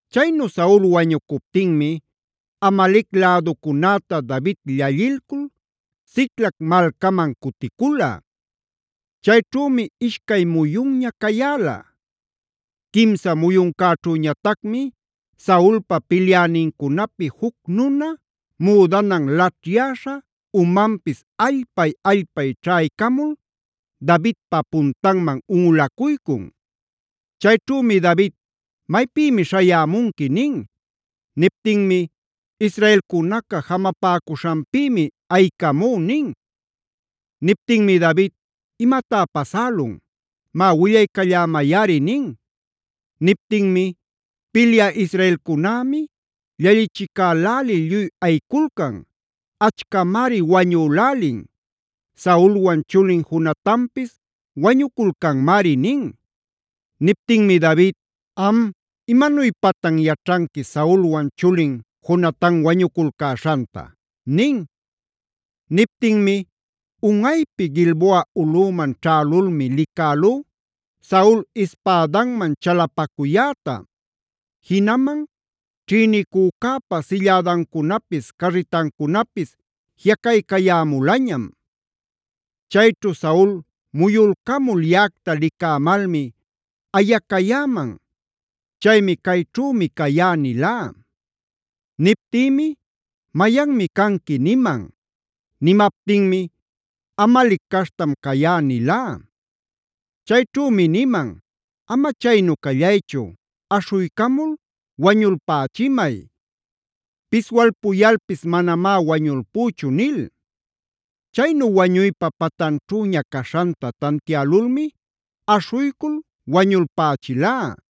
Chaynu Saul wañucuptinmia Amalec läducunäta David llallilcul Siclagb malcaman cuticula. Chayćhümi ishcay muyunña cayäla. Quimsa muyuncäćhüñatacmi Saulpa pilyänincunapi juc nuna müdanan laćhyäśha, umanpis allpay-allpay ćhaycamul Davidpa puntanman unꞌulacuycun. Chayćhümi David: “¿Maypïmi śhayämunqui?” nin. Niptinmi: “Israelcunaca jamapäcuśhanpïmi ayicamú” nin. Niptinmi David: “¿Imatá pasälun? ¡Má, willaycallämayꞌari!” nin. Niptinmi: “Pilyä israelcunämi llallichicälälil lluy ayiculcan. Achcamari wañülälin; Saulwan chulin Jonatanpis wañuculcanmari” nin. Niptinmi David: “¿Am imanuypatan yaćhanqui Saulwan chulin Jonatan wañuculcäśhanta?” nin. Niptinmi: “Unꞌaypi Gilboa ulꞌüman ćhälulmi licälú Saul ispädanman chalapacuyäta. Jinaman ćhïnicücäpa sillädancunapis carritancunapis jiꞌacaycayämulañam. Chayćhu Saul muyulcamul yaꞌacta licämalmi ayacayäman. Chaymi: ‘Cayćhümi cayá’ nilá. Niptïmi: ‘¿Mayanmi canqui?’ niman. Nimaptinmi: ‘Amalec caśhtam cayá’ nilá. Chayćhümi niman: ‘Ama chaynu callaychu, aśhuycamul wañulpächimay. Piswalpuyalpis manamá wañulpüchu’ nil. Chaynu wañuypa patanćhüña caśhanta tantiälulmi aśhuycul wañulpächilá.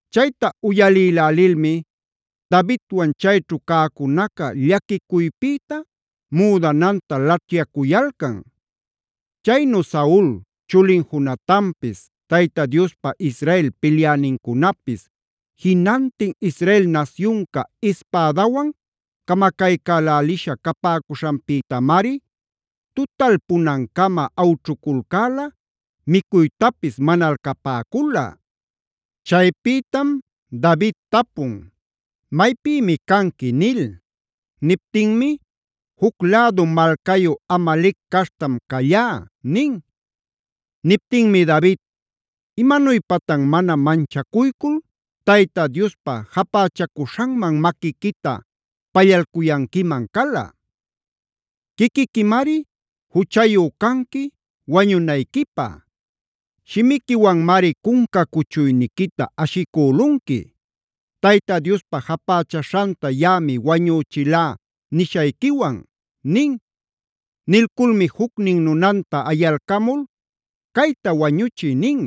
Chayta uyalïlälilmi Davidwan chayćhu cäcunaca llaquicuypïta müdananta laćhyacuyalcan. Chaynu Saul, chulin Jonatanpis, Tayta Diospa Israel pilyänincunapis, jinantin Israel nasyunca ispädawan camacaycälälisha capäcuśhanpïtamari tutalpunancama awćhuculcäla, micuytapis manalcapäcula. Chaypïtam David tapun: “¿Maypïmi canqui?” nil. Niptinmi: “Juc lädu malcayu Amalec caśhtam callá” nin. Niptinmi David: “¿Imanuypatan mana manchacuycul Tayta Diospa japächacuśhanman maquiquita pallalcuyanquiman cala? Quiquiquimari juchayu canqui wañunayquipä. Shimiquiwanmari cunca cuchuyniquita ashicülunqui: ‘Tayta Diospa japächaśhanta yaꞌami wañüchilá’ nishayquiwan” nin. Nilculmi jucnin nunanta ayalcamul: “¡Cayta wañuchiy!” nin.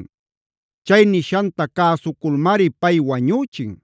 Chay nishanta cäsuculmari pay wañüchin.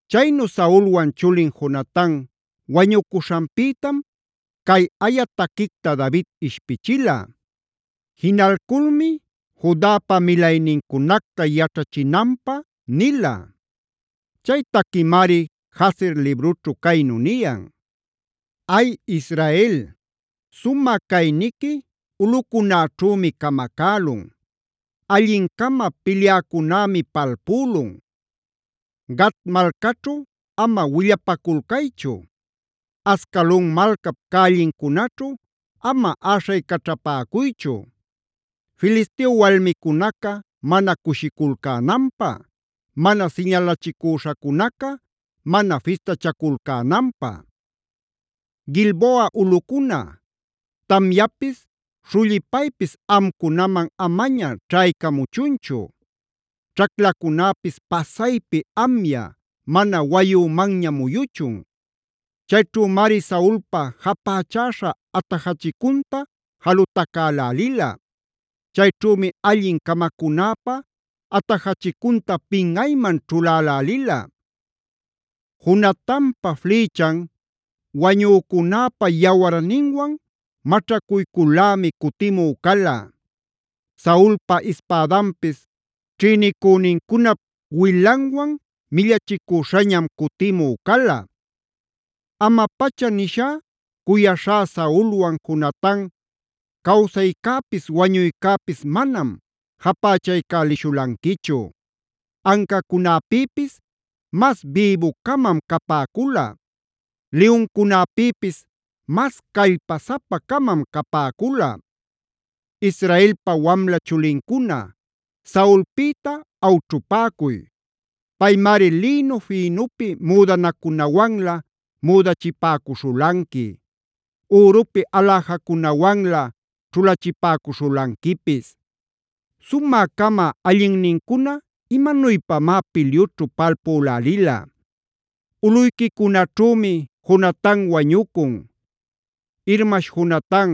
Chaynu Saulwan chulin Jonatan wañucuśhanpïtam cay aya taquicta David ishpichila. Jinalculmi Judapa milaynincunacta yaćhachinanpä nila. Chay taquimari Jaser librućhud caynu niyan: “¡Ay Israel! Sumä cayniqui ulꞌucunäćhümi camacälun. ¡Allin-cama pilyäcunämi palpülun! Gate malcaćhu ama willapaculcaychu.f Ascalong malcap cällincunaćhu ama äśhaycaćhapäcuychu; Filisteo walmicunaca mana cushiculcänanpä; Mana siñalachicüśhacunaca mana fistachaculcänanpä. “¡Gilboa ulꞌucuna, tamyapis, śhullipaypis amcunaman amaña ćhaycamuchunchu! ¡Ćhaclacunäpis pasaypi amya mana wayümanña muyuchun! Chayćhümari Saulpa japächäśha atajachicunta jalutacälälila; ¡Chayćhümi allin-camacunäpä atajachicunta pinꞌayman ćhulälälila! “¡Jonatanpa flïchan wañücunäpa yawarninwan maćhacuyculꞌlämi cutimü cala; Saulpa ispädanpis ćhïnicünincunap wilanwan millachicüśhañam cutimü cala! “Ama-pacha nishá, cuyaśhá Saulwan Jonatan, cawsaycäpis wañuycäpis manam japächaycälishulanquichu. Ancacunäpïpis mas bïbu-camam capäcula. Liyuncunäpïpis mas callpasapa-camam capäcula. “Israelpa wamla chulincuna Saulpïta awćhupäcuy. Paymari lïnu fïnupi müdanacunawanlä müdachipäcuśhulanqui; ürupi aläjacunawanlä ćhulachipäcuśhulanquipis. ¡Sumä-cama allinnincuna imanuypamá pilyućhu palpülälila! ¡Ulꞌuyquicunaćhümi Jonatan wañucun! Irmash Jonatan,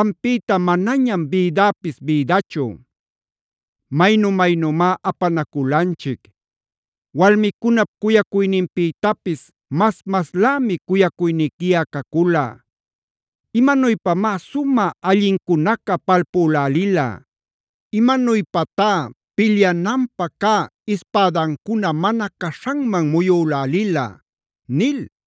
ampïta manañam bïdäpis bïdachu. Maynu-maynümá apanaculanchic. Walmicunap cuyacuyninpïtapis mas-maslämi cuyacuyniquiꞌa cacula. ¡Imanuypamá sumä-allincunaca palpülälila! ¡Imanuypatá pilyananpä cä ispädancuna mana caśhanman muyülälila!” nil.